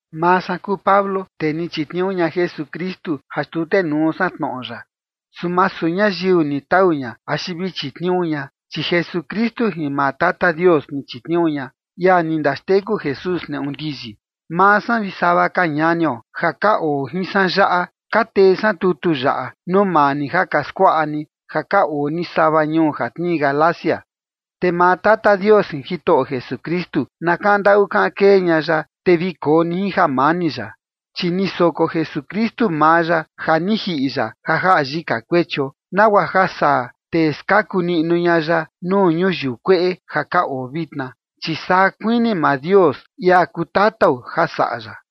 Maa san kuu Pablo tee ni chitniuu ña Jesukristu ja xtutenuu san tnoꞌo ya, su masu ñayiu ni tau ña axi vi chitniuu ña, chi Jesukristu jin maa Tata Dios ni chitniuu ña, ia ni ndaxteku Jesús neꞌu ndiyi. Maa san vi sava ka ñanio ja ka oo jin san yaꞌa, ka tee san tutu yaꞌa nuu maa ni ja ka skuaꞌa ni ja ka oo ni sava ñuu ja tnii Galacia. Te maa Tata Dios jin Jitoꞌo Jesukristu na kaꞌan ndaꞌu kaꞌan kee ña ya, te vi koo ni jin jamani ya. Chi ni soko Jesukristu maa ya ja ni jiꞌi ya ja jaꞌa yika kuechio, nagua ja saa te skaku niꞌnu ña ya nuu ñuyiu kueꞌe ja ka oo vitna, chi saa kuini maa Dios, ia kuu Tatao, ja saꞌa ya.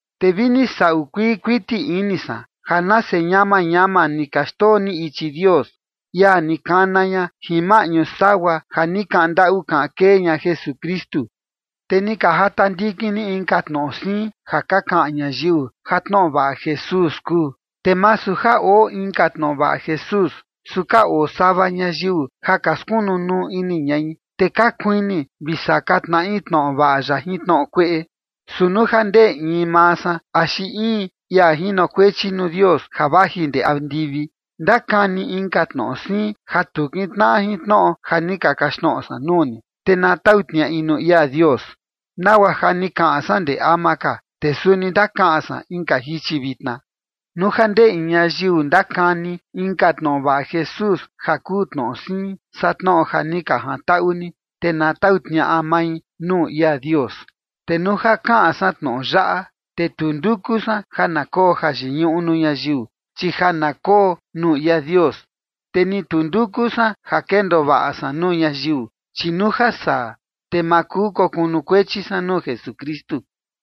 Te vini saꞌu kuii kuiti ini san, ja nase ñama ñama ni ka xndoo ni ichi Dios, ia ni kana ña jin maꞌñu sagua ja ni kaꞌan ndaꞌu kaꞌan kee ña Jesukristu, te ni ka jata ndikin ni inka tnoꞌo siin ja ka kaꞌan ñayiu ja tnoꞌo vaꞌa Jesús kuu. Te masu ja oo inka tnoꞌo vaꞌa Jesús, su ka oo sava ñayiu ja ka skunu nuu ini ñai, te ka kuini vi saka tnaꞌi tnoꞌo vaꞌa ya jin tnoꞌo kueꞌe. Su nuu ja ndee in maa san, axi in ia jinokuechi nuu Dios ja vaji ndee andivi, ndakani inka tnoꞌo siin ja tu kintnaꞌa jin tnoꞌo ja ni ka kaxtnoꞌo san nuu ni, te na tau tniaꞌi nuu ia Dios. Nagua ja ni kaꞌan san ndee ama ka, te suni ndakaꞌan san inka jichi vitna: Nuu ja ndee in ñayiu ndakani inka tnoꞌo vaꞌa Jesús ja kuu tnoꞌo siin saa tnoꞌo ja ni ka jantaꞌu ni, te na tau tniaꞌa mai nuu ia Dios. Te nuu ja kaꞌan san tnoꞌo yaꞌa, te tu nduku san ja na koo jayiñuꞌu nuu ñayiu, chi ja na koo nuu ia Dios. Te ni tu nduku san ja kendoo vaꞌa san nuu ñayiu, chi nuu ja saa, te ma kuu kokunukuechi san nuu Jesukristu.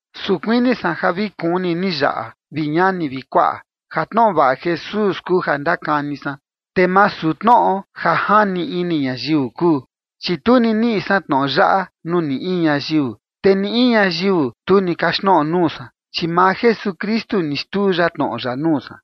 Su kuini san ja vi kuni ni yaꞌa, vi ñani vi kuaꞌa, ja tnoꞌo vaꞌa Jesús kuu ja ndakani san, te masu tnoꞌo ja jani ini ñayiu kuu. Chi tu ni niꞌi san tnoꞌo yaꞌa nuu ni in ñayiu, te ni in ñayiu tu ni kaxtnoꞌo nuu san, chi maa Jesukristu ni xtuu ya tnoꞌo ya nuu san.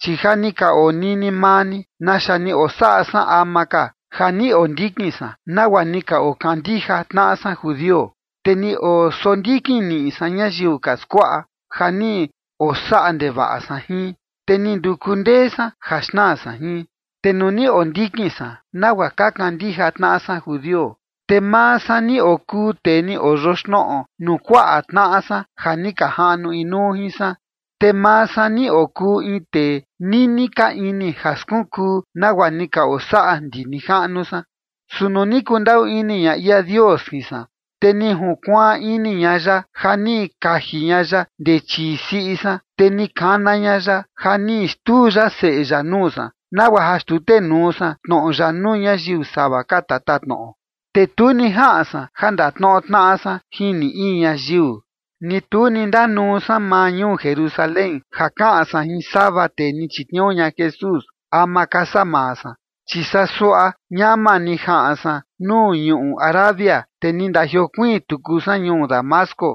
Chi ja ni ka onini maa ni, naxa ni osaꞌa san ama ka ja ni ondikin san nagua ni ka okandija tnaꞌa san judio, te ni osondikin niꞌi san ñayiu ka skuaꞌa ja ni osaꞌa ndevaꞌa san jin, te ni nduku ndee san ja xnaa san jin. Te nuu ni ondikin san nagua ka kandija tnaꞌa san judio, te maa san ni okuu tee ni oyoxnoꞌo nuu kuaꞌa tnaꞌa san ja ni ka jaꞌnu inuu jin san, te maa san ni okuu in tee nini ka ini ja skunkuu nagua ni ka osaꞌa ndi nijaꞌnu san. Su nuu ni kundaꞌu ini ña ia Dios jin san, te ni junkuaan ini ña ya ja ni kaji ña ya ndee chii siꞌi san, te ni kana ña ya, ja ni xtuu ya Seꞌe ya nuu san, nagua ja xtutenuu san tnoꞌo ya nuu ñayiu sava ka tatatnoꞌo. Te tu ni jaꞌan san ja ndatnoꞌo tnaꞌa san jin ni in ñayiu, ni tu ni ndanuu san maa ñuu Jerusalén ja kaꞌan san jin sava tee ni chitniuu ña Jesús ama ka saa maa san, chi saa suaꞌa ñama ni jaꞌan san nuu ñuꞌu Arabia, te ni ndajiokuiin tuku san ñuu Damasco.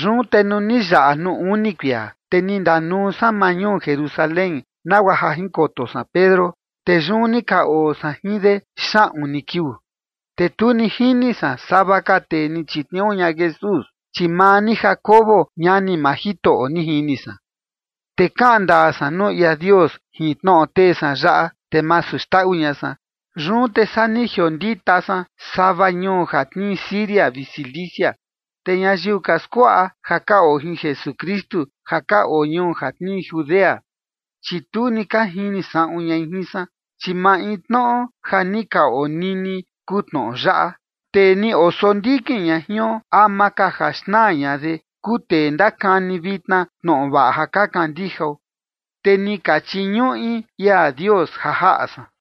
Yun te nuu ni yaꞌa nuu uni kuia, te ni ndanuu san maa ñuu Jerusalén nagua ja jinkoto san Pedro, te yun ni ka oo san jin de xaꞌun ni kiuu. Te tu ni jini san sava ka tee ni chitniuu ña Jesús, chi maa ni Jacobo, ñani maa Jitoꞌo, ni jini san. Te kaꞌan ndaa san nuu ia Dios jin tnoꞌo tee san yaꞌa, te masu xndaꞌu ña san. Yun te saa ni jiondita san sava ñuu ja tnii Siria vi Cilicia. Te ñayiu ka skuaꞌa ja ka oo jin Jesukristu ja ka oo ñuu ja tnii Judea, chi tu ni ka jini saꞌun ñai jin san, chi maintnoꞌo ja ni ka onini kuu tnoꞌo yaꞌa: “Tee ni osondikin ña jion ama ka ja xnaa ña de, kuu tee ndakani vitna tnoꞌo vaꞌa ja ka kandijao”. Te ni ka chiñuꞌi ia Dios ja jaꞌa san.